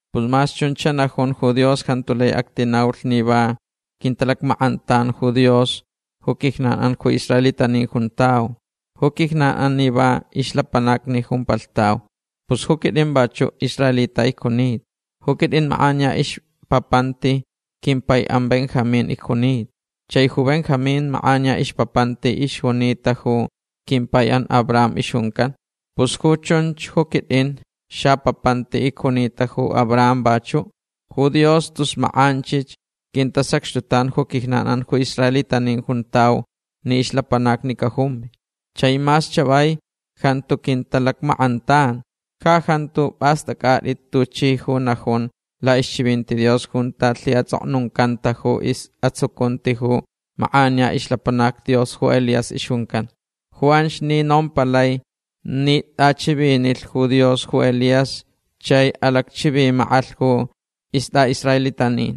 Pus mas chun xanajun ju Dios jantu lai actinaulh ni va quintalacmackʼantan ju Dios ju quijnanʼan ju israelitanin juntau. Ju quijnanʼan ni va ixlapanacni jumpalhtau. Pus ju quitʼin vachuʼ israelita icjunita. Ju quitʼin makʼaniya ixpapanti quimpaiʼan Benjamín icjunita. Chai ju Benjamín makʼaniya ixpapanti ixjunita ju quimpaiʼan ju Abraham ixjuncan. Pus ju chunch ju quitʼin xapapanti icjunita ju Abraham vachuʼ. Ju Dios tus makʼanchich quintasacxtutan ju quijnanʼan ju israelitanin juntau ni ixlapanacni cajumvi. Chai mas chavai jantu quintalacmackʼantan. Ja jantu pʼastʼacʼatʼit tuchi ju najun laʼixchivinti Dios junta lhaʼatsʼoknuncanta ju isʼatsucunti ju makʼaniya ixlapanac Dios ju Elías ixjuncan. Ju anch ni nompalai ni tʼachivinilh ju Dios ju Elías chai alacchivimakʼalh ju istʼaʼisraelitanin.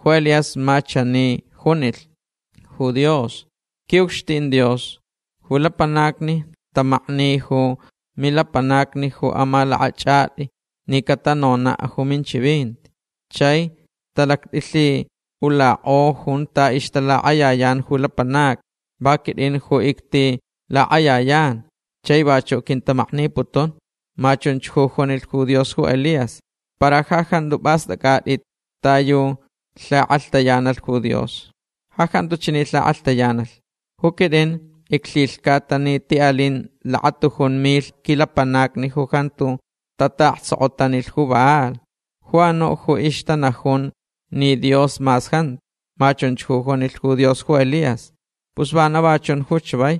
Ju Elías ma chani junilh ju Dios: “Quiʼucxtin Dios ju lapanacni tamaknilh ju milapanacni ju amalakʼachʼatʼi ni catanonaʼ ju minchivinti. Chai talactʼilhiʼulakʼolh junta ixtalakʼayayan ju lapanacni. Va quitʼin ju ictilakʼayayan chai vachuʼ quintamakniputun”. Ma chunch ju junilh ju Dios ju Elías. Para ja jantu pʼastʼacʼatʼit ta yu alhikʼalhtayanalh ju Dios. Ja jantu chani alhikʼalhtayanalh. “Ju quitʼin iclhilhcata ni tiʼalin lakatujun milh quilapanacni ju jantu tataʼaktsokotanilh ju Baal. Ju anuʼ ju ixtanajunch ni Dios mas jantu”. Ma chunch ju junilh ju Dios ju Elías. Pus vana va chun ju chavai.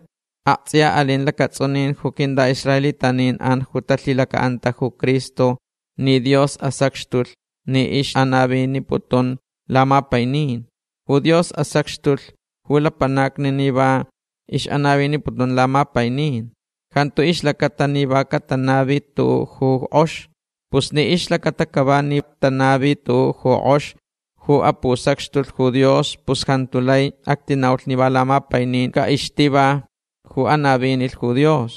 Aktsʼiya alin lacatsʼunin ju quintʼaʼisraelitanin ju talhilacaʼanta ju Cristo ni Dios asacxtulh ni ixʼanaviniputun lamapainin. Ju Dios asacxtulh ju lapanacni ni va ixʼanaviniputun lamapainin. Jantu ixlacata ni va catanavilh ju tuʼuʼ ju kʼox. Pus ni ixlacata cava ni tanavilh tuʼuʼ ju kʼox ju apusacxtulh ju Dios pus jantu lai actinaulh ni va lamapainin caʼixtiva ju anavinilh ju Dios.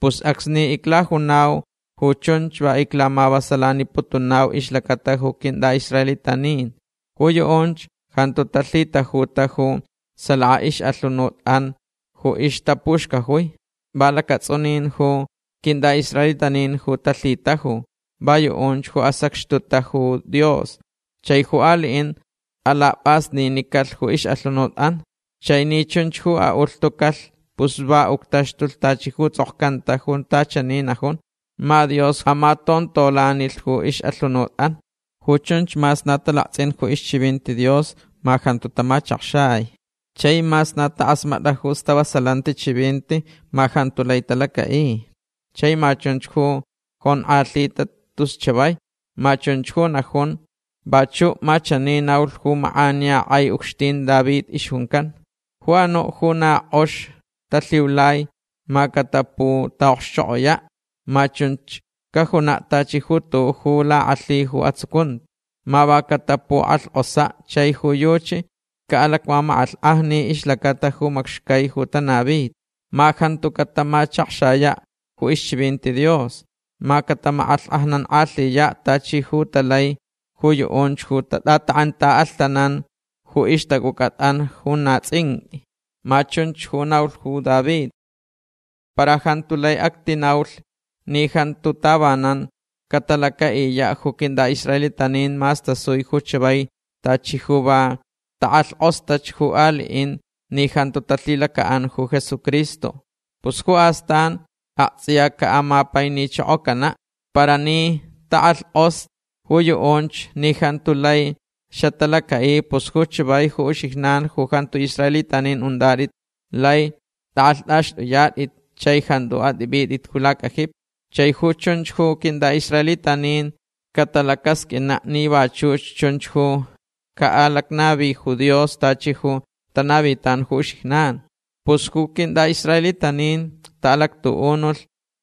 Pus acsni iclajunau ju chunch va iclamavasalaniputunau ixlacata ju quintʼaʼisraelitanin. Ju yuʼunch jantu talhitajuta ju salaka ixʼalhunutʼan ju ixtapuxcajui. Va lacatsʼunin ju quintʼaʼisraelitanin ju talhitajuta. Va yuʼunch ju asacxtutach ju Dios. Chai ju aliʼin alapʼasninicalh ju ixʼalhunutʼan. Chai ni chunch ju aʼulhtucalh pus va uctaxtulh tachi ju tsʼokcanta junta chani najun: “Ma Dios ju amatontolanilh ju ixʼalhunutʼan. Ju chunch mas na talaktsʼin ju ixchivinti Dios ma jantu tamachakxai. Chai mas na takʼasmatʼa ju stavasalanti chivinti ma jantu lai talacaʼi. Chai ma chunch ju jonkʼalhita tus chavai”. Ma chunch ju najun. Vachuʼ ma chani naulh ju makʼaniya kʼai ucxtin ju David ixjuncan: Ju anuʼ ju na kʼox talhiulai ma cataputaʼokxchokʼoyaʼ. Ma chun cajunaʼ tachi ju tuʼuʼ ju lakʼalhi ju atsucunti. Ma va catapukʼalhkʼosaʼ chai ju yuchi caʼalacmamakʼalhkʼajni ixlacata ju macxcai ju tanavita. Ma jantu catamachakxayaʼ ju ixchivinti Dios. Ma catamakʼalhkʼajnankʼalhiyaʼ tachi ju talai ju yuʼunch ju tatʼatakʼentaʼalhtananch ju ixtacʼucʼatʼan ju na tsʼinqʼui. Ma chunch ju naulh ju David. Para jantu lai actinaulh ni jantu tavanan catalacaʼiyaʼ ju quintʼaʼisraelitanin mas tasui ju chavai tachi ju va takʼalhkʼostach ju aliʼin ni jantu talhilacaʼanta ju Jesucristo. Pus ju astan aktsʼiya caʼamapainichokocanaʼ. Para ni takʼalhkʼoslh ju yuʼunch ni jantu lai xatalacaʼi pus ju chavai ju uxijnan ju jantu israelitanin untʼatʼit lai tʼakʼalhtʼaxtʼuyatʼit chai jantu atʼipʼitʼit ju lacajipi. Chai ju chunch ju quintʼaʼisraelitanin catalacasqʼuinaʼ ni vachuch chunch ju caʼalacnavi ju Dios tachi ju tanavitan ju uxijnan. Pus ju quintʼaʼisraelitanin taʼalactuʼunulh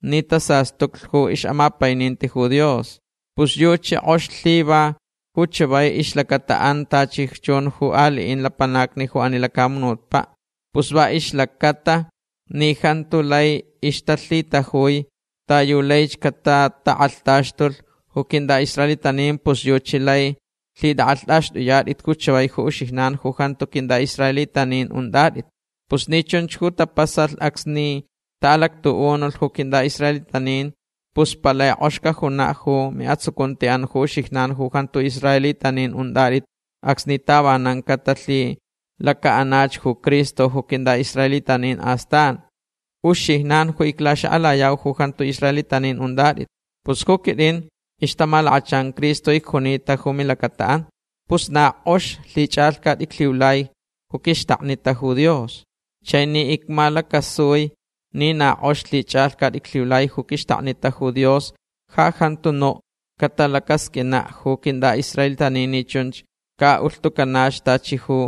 ni tasastuclh ju ixʼamapaininti ju Dios. Pus yuchi kʼox lhiva ju chavai ixlacataʼan tachi chun ju aliʼin lapanacni ju ani lacamunutpaʼ. Pus va ixlacaʼatalh ni jantu lai ixtalhitajui ta yu laich catatakʼalhtaxtulh ju quintʼaʼisraelitanin pus yuchi lai lhitʼakʼalhtʼaxtʼuyatʼit ju chavai ju uxijnan ju jantu quintʼaʼisraelitanin untʼatʼit. Pus ni chunch ju tapasalh acsni taʼalactuʼunulh ju quintʼaʼisraelitanin pus palai kʼox cajunaʼ ju miʼatsucuntiʼan ju uxijnan ju jantu israelitanin untʼatʼit acsni tavanan catalhilacaʼanach ju Cristo ju quintʼaʼisraelitanin astan. Uxijnan ju iclaxakʼalayau ju jantu israelitanin untʼatʼit. Pus ju quitʼin ixtamalakachan Cristo icjunita ju milacataʼan. Pus na kʼox lhichʼalhcat iclhiulai ju quixtaknita ju Dios. Chai ni icmalacasui ni na kʼox lhichʼalhcat iclhiulai ju quixtaknita ju Dios ja jantu nuʼ catalacasqʼuinaʼ ju quintʼaʼisraelitanin ni chunch caʼaʼulhtucanach tachi ju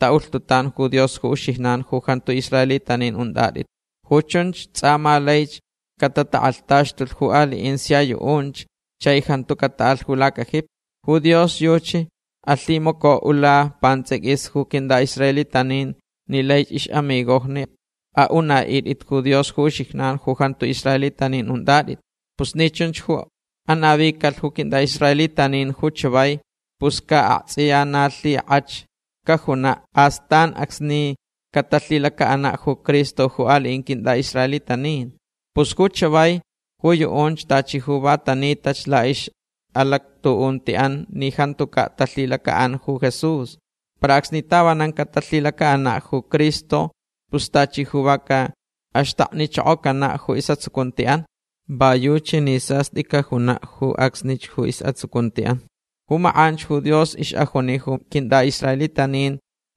taʼulhtutan ju Dios ju uxijnan ju jantu israelitanin untʼatʼit. Ju chunch tsʼa ma laich catatakʼalhtaxtulh ju aliʼin sia yuʼunch chai jantu cataʼalh ju lacajipi. Ju Dios yuchi alhimacaʼula pantsʼiquis ju quintʼaʼisraelitanin ni laich ixʼamigojni aʼunaʼitʼit ju Dios ju uxijnan ju jantu israelitanin untʼatʼit. Pus ni chunch ju anavicalh ju quintʼaʼisraelitanin ju chavai pus ca aktsʼiya na lhikʼach cajunaʼ astan acsni catalhilacaʼanaʼ ju Cristo ju aliʼin quintʼaʼisraelitanin. Pus ju chavai ju yuʼunch tachi ju va tanitach laʼixʼalactuʼuntiʼan ni jantucaʼ talhilacaʼanta ju Jesús. Para acsni tavanan catalhilacaʼanach ju Cristo pus tachi ju va caʼaxtaknichokocanaʼ ju isʼatsucuntiʼan. Va yuchi ni sastʼi cajunaʼ ju acsnich ju isʼatsucuntiʼan. Ju makʼanch ju Dios ixʼajuni ju quintʼaʼisraelitanin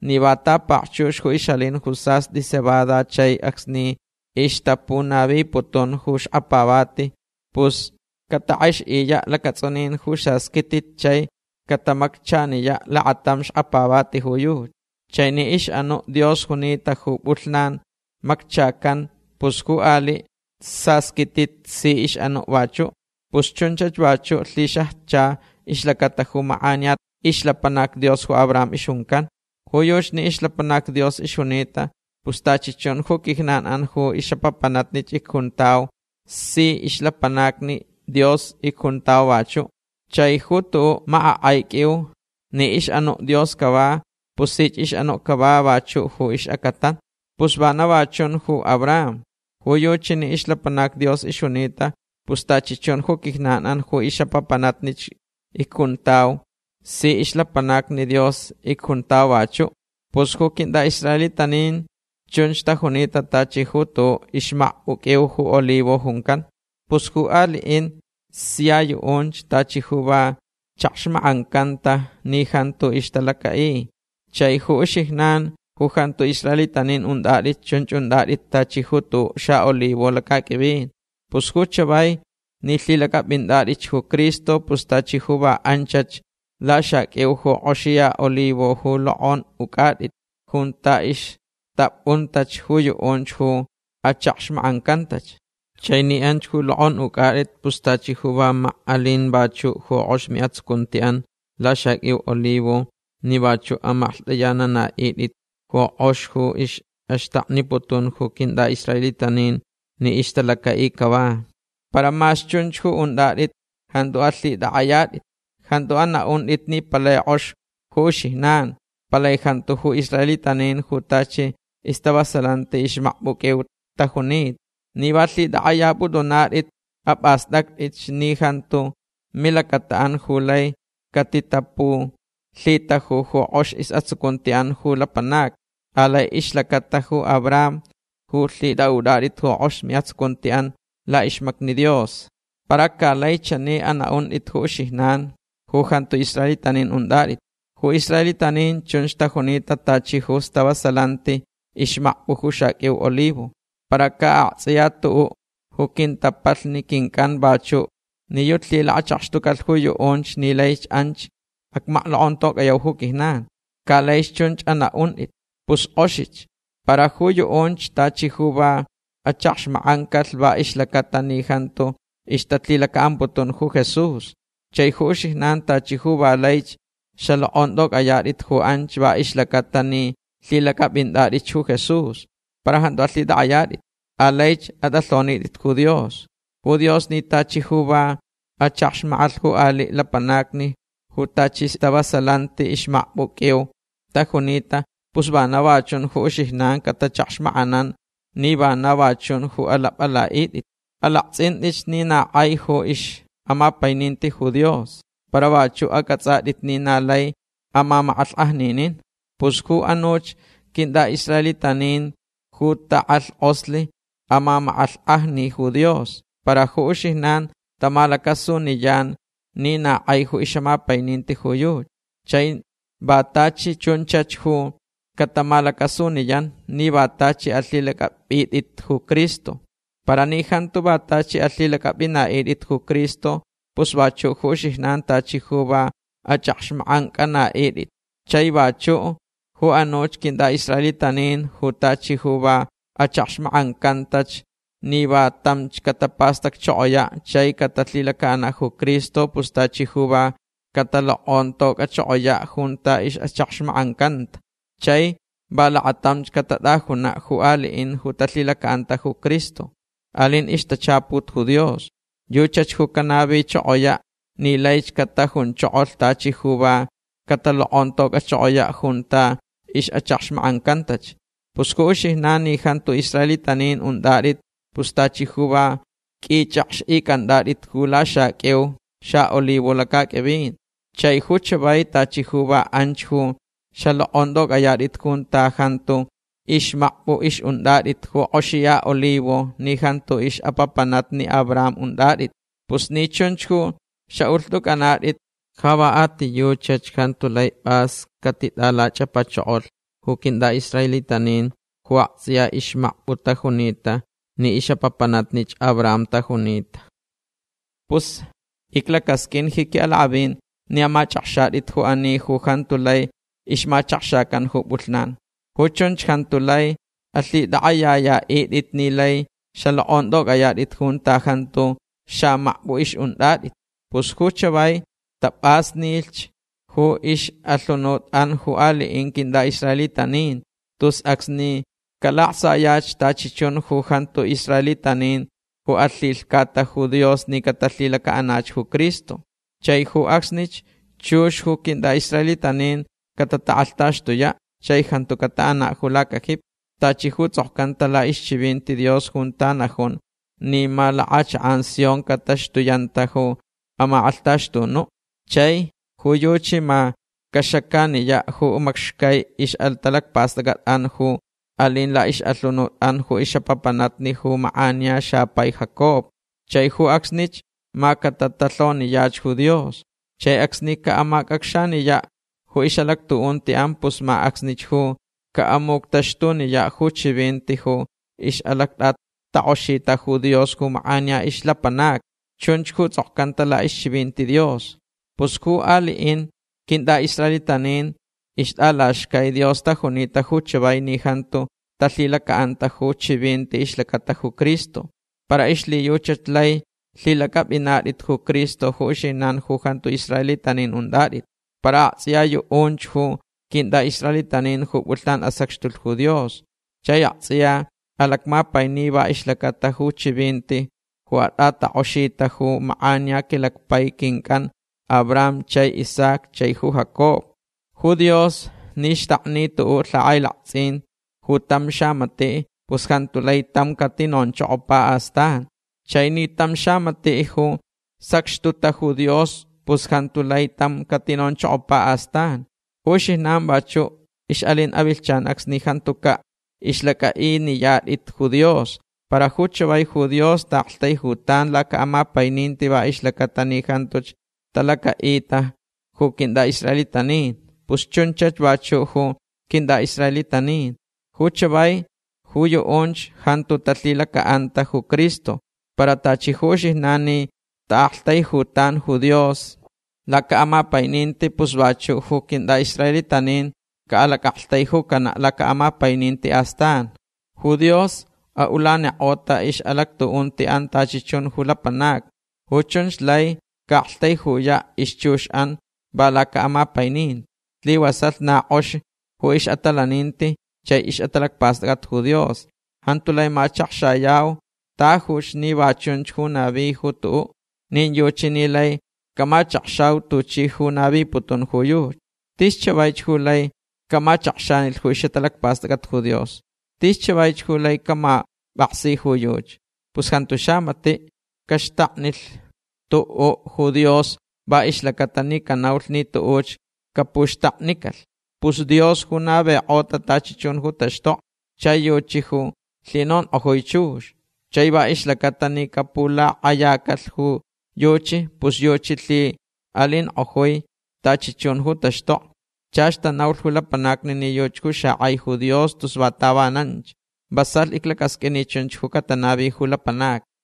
ni va tapakchux ju ixʼalin ju sastʼi cebada chai acsni ixtapunaviputun ju xkapavati pus catakʼextayaʼ lacatsʼunin ju sasquitit chai catamacchaniyaʼ lakatam xkapavati ju yuchi. Chai ni ixʼanuʼ Dios junita ju pʼulhnan macchacan pus ju aliʼ sasquitit si ixʼanuʼ vachuʼ. Pus chunchach vachuʼ lhixajcha ixlacata ju makʼaniya ixlapanac Dios ju Abraham ixjuncan. Ju yuchi ni ixlapanac Dios ixjunita pus tachi chun ju quijnan ju ixʼapapanatnich icjuntau si ixlapanacni Dios icjuntau vachuʼ. Chai ju tuʼuʼ makʼakʼai qʼuiu ni ixʼanuʼ Dios cava pus sich ixʼanuʼ cava vachuʼ ju ixacatan. Pus vana va chun ju Abraham. Ju yuchi ni ixlapanac Dios ixjunita pus tachi chun ju quijnan ju ixʼapapanatnich icjuntau si ixlapanacni Dios icjuntau vachuʼ. Pus ju quintʼaʼisraelitanin chunch tajunita tachi ju tuʼuʼ ixmakpʼu qʼuiu ju olivo juncan. Pus ju aliʼin sia yuʼunch tachi ju va chakxmakʼancanta ni jantu ixtalacaʼi. Chai ju uxijnan ju jantu israelitanin untʼatʼit chunch untʼatʼit tachi ju tuʼuʼ xaʼolivo lacaqʼuivin. Pus ju chavai ni lhilacʼapʼintʼatʼitch ju Cristo pus tachi ju va anchach laxaqʼuiu ju kʼoxiya olivo ju lokʼonʼucʼatʼit junta ixtapʼuntach ju yuʼunch ju achakxmakʼancantach. Chai ni anch ju lokʼonʼucʼatʼit pus tachi ju va mak alin vachuʼ ju kʼox miʼatsucuntiʼan laxaqʼuiu olivo ni vachuʼ amaklhtʼayananaʼitʼit ju kʼox ju ixʼaxtakniputun ju quintʼaʼisraelitanin ni ixtalacaʼilhch cava. Para mas chunch ju untʼatʼit jantu alhitʼakʼayatʼit. Jantu anaʼuntʼit ni palai kʼox ju uxijnan. Palai jantu ju israelitanin ju tachi istavasalanti ixmakpʼu qʼuiu tajunita. Ni va lhitʼakʼayapʼutʼunatʼit apʼastʼactʼitch ni jantu milacataʼan ju lai catitapulhitaju ju kʼox isʼatsucuntiʼan ju lapanacni. Alai ixlacata ju Abraham ju lhitʼaʼutʼatʼit ju kʼox miʼatsucuntiʼan laʼixmacni Dios. Para ca lai chani anaʼuntʼit ju uxijnan ju jantu israelitanin untʼatʼit: “Ju israelitanin chunch tajunita tachi ju istavasalanti ixmakpʼu ju xaqʼuiu olivo. Para ca aktsʼiya tuʼuʼ ju quintapalhni quincʼan vachuʼ ni yuchi lhilakachakxtucalh ju yuʼunch ni laich anch acmaklokʼontocʼayau ju quijnan”. Ca laich chunch anaʼuntʼit. Pus kʼoxich. Para ju yuʼunch tachi ju va achakxmakʼancalh va ixlacata ni jantu ixtalhilacaʼamputun ju Jesús. Chai ju uxijnan tachi ju va laich xalokʼontʼocʼayatʼit ju anch va ixlacaʼatalh ni lhilacʼapʼintʼatʼitch ju Jesús. Para jantu alhitʼakʼayatʼit. Alaich atʼalhonitʼit ju Dios. Ju Dios ni tachi ju va achakxmakʼalh ju aliʼ lapanacni ju tachi istavasalanti ixmakpʼu qʼuiu tajunita pus vana ju uxijnan catachakxmakʼananch ni vana va chun ju alapʼalaʼitʼit. Alaktsʼintʼitch ni na kʼai ju ixʼamapaininti ju Dios. Para vachuʼ acʼatsʼatʼit ni na lai amamakʼalhkʼajninin. Pus ju anuch quintʼaʼisraelitanin ju takʼalhkʼoslh amamakʼalhkʼajni ju Dios. Para ju uxijnan tamalacasuniyan ni na kʼai ju ixʼamapaininti ju yuchi. Chai va tachi chunchach ju catamalacasuniyanch ni va tachi alhilacʼapʼitʼit ju Cristo. Para ni jantu va tachi alhilacʼapʼinaʼitʼit ju Cristo pus vachuʼ ju uxijnan tachi ju va achʼakxmakʼancʼanaʼitʼit. Chai vachuʼ ju anuch quintʼaʼisraelitanin ju tachi ju va achakxmakʼancantach ni va tamch catapastacchokoyaʼ chai catalhilacaʼanaʼ ju Cristo pus tachi ju va catalokʼontocʼachokoyaʼ junta ixʼachakxmakʼancanta. Chai va lakatamch catatʼajunaʼ ju aliʼin ju talhilacaʼanta ju Cristo. Alin ixtachaput ju Dios. Yuchach ju canavichokoyaʼ ni laich catajunchokolh tachi ju va catalokʼontocʼachokoyaʼ junta ixʼachakxmakʼancantach. Pus ju uxijnan ni jantu israelitanin untʼatʼit pus tachi ju va qʼuichʼakxʼicʼantʼatʼit ju laxaqʼuiu xaʼolivo lacaqʼuivin. Chai ju chavai tachi ju va anch ju xalokʼontʼocʼayatʼit junta jantu ixmakpʼu ixʼuntʼatʼit ju kʼoxiya olivo ni jantu ixʼapapanatnich Abraham untʼatʼit. Pus ni chunch ju xaʼulhtʼucʼanatʼit ju uxijnan ja va a ti yuchach jantu lai pʼas catitʼalachʼapachokolh ju quintʼaʼisraelitanin ju aktsʼiya ixmakpʼu tajunita ni ixʼapapanatnich Abraham tajunita. Pus iclacasqʼuin ji quiʼalakʼavin ni amachʼakxatʼit ju ani ju jantu lai ixmachakxacan ju pʼulhnan. Ju chunch jantu lai alhitʼakʼayayaʼitʼit ni lai xalokʼontʼocʼayatʼit junta jantu xamakpʼu ixʼuntʼatʼit. Pus ju chavai tapʼasnilh ju ixʼalhunutʼan ju aliʼin quintʼaʼisraelitanin tus acsni calaktsayach tachi chun ju jantu israelitanin ju alhilhcata ju Dios ni catalhilacaʼanach ju Cristo. Chai ju acsnich chux ju quintʼaʼisraelitanin catatakʼalhtaxtuyaʼ chai jantu cataʼanaʼ ju lacajipi. Tachi ju tsʼokcanta laʼixchivinti Dios junta najun ni ma lakʼachakʼan Sion cataxtuyanta ju amakʼalhtaxtunuʼ. Chai ju yuchi ma caxacaniyaʼ ju macxcai ixʼatalacpastʼacʼatʼan ju alin laʼixʼalhunutʼan ju ixʼapapanatnich ju makʼaniya xapai Jacob. Chai ju acsnich ma catatalhoniyach ju Dios. Chai acsni caʼamacʼacxaniyaʼ ju ixʼalactuʼuntiʼan pus ma acsnich ju caʼamuctaxtuniyaʼ ju chivinti ju ixʼalactʼatakʼoxita ju Dios ju makʼaniya ixlapanacni. Chunch ju tsʼokcanta laʼixchivinti Dios. Pus ju aliʼin quintʼaʼisraelitanin ixtʼalaxcai Dios tajunita ju chavai ni jantu talhilacaʼanta ju chivinti ixlacata ju Cristo. Para ixlhiyuchach lai lhilacʼapʼinatʼit ju Cristo ju uxijnan ju jantu israelitanin untʼatʼit. Para aktsʼiya yuʼunch ju quintʼaʼisraelitanin ju pʼulhnan asacxtulh ju Dios. Chai aktsʼiya alacmapaini va ixlacata ju chivinti ju atʼatakʼoxita ju makʼaniya quilacpai quincʼan Abraham chai Isaac chai ju Jacob. Ju Dios ni xtakni tuʼuʼ lhakʼailaktsʼin ju tam xamatiʼ pus jantu lai tam catinonchokopa astan. Chai ni tam xamatiʼ ju sacxtutach ju Dios pus jantu lai tam catinonchokopa astan. Ju uxijnan vachuʼ ixʼalin avilhchan acsni jantucaʼ ixlacʼaʼiniyatʼit ju Dios. Para ju chavai ju Dios taʼaktaijutan lacaʼamapaininti va ixlacaʼatalh ni jantuch talacaʼita ju quintʼaʼisraelitanin. Pus chunchach vachuʼ ju quintʼaʼisraelitanin. Ju chavai ju yuʼunch jantu talhilacaʼanta ju Cristo. Para tachi ju uxijnan ni taʼaktaijutan ju Dios lacaʼamapaininti pus vachuʼ ju quintʼaʼisraelitanin caʼalacʼaktaijucanaʼ lacaʼamapaininti astan. Ju Dios aʼulanikʼota ixʼalactuʼuntiʼan tachi chun ju lapanacni. Ju chunch lai caʼaktaijuyaʼ ixchuxʼan va lacaʼamapaininti. Slivasalh na kʼox ju ixʼatalaninti chai ixʼatalacpastʼacʼat ju Dios. Jantu lai machakxayau tajuch ni va chunch ju navi ju tuʼuʼ. Nin yuchi ni lai camachakxau tuchi ju naviputun ju yuchi. Tis chavaich ju lai camachakxanilh ju ixʼatalacpastʼacʼat ju Dios. Tis chavaich ju lai camapʼaksi ju yuchi. Pus jantu xamatiʼ caxtaknilh tuʼuʼ ju Dios va ixlacaʼatalh ni canaulh ni tuʼuch capuxtaknicalh. Pus Dios ju navikʼota tachi chun ju taxtokni. Chai yuchi ju lhinonkʼojui chux. Chai va ixlacata ni capulakʼayacalh ju yuchi pus yuchi lhiʼalinkʼojui tachi chun ju taxtokni. Chach tanaulh ju lapanacni ni yuchi ju xakʼai ju Dios tus va tavananch. Vasalh iclacasqʼuin ni chunch catanavi ju lapanacni.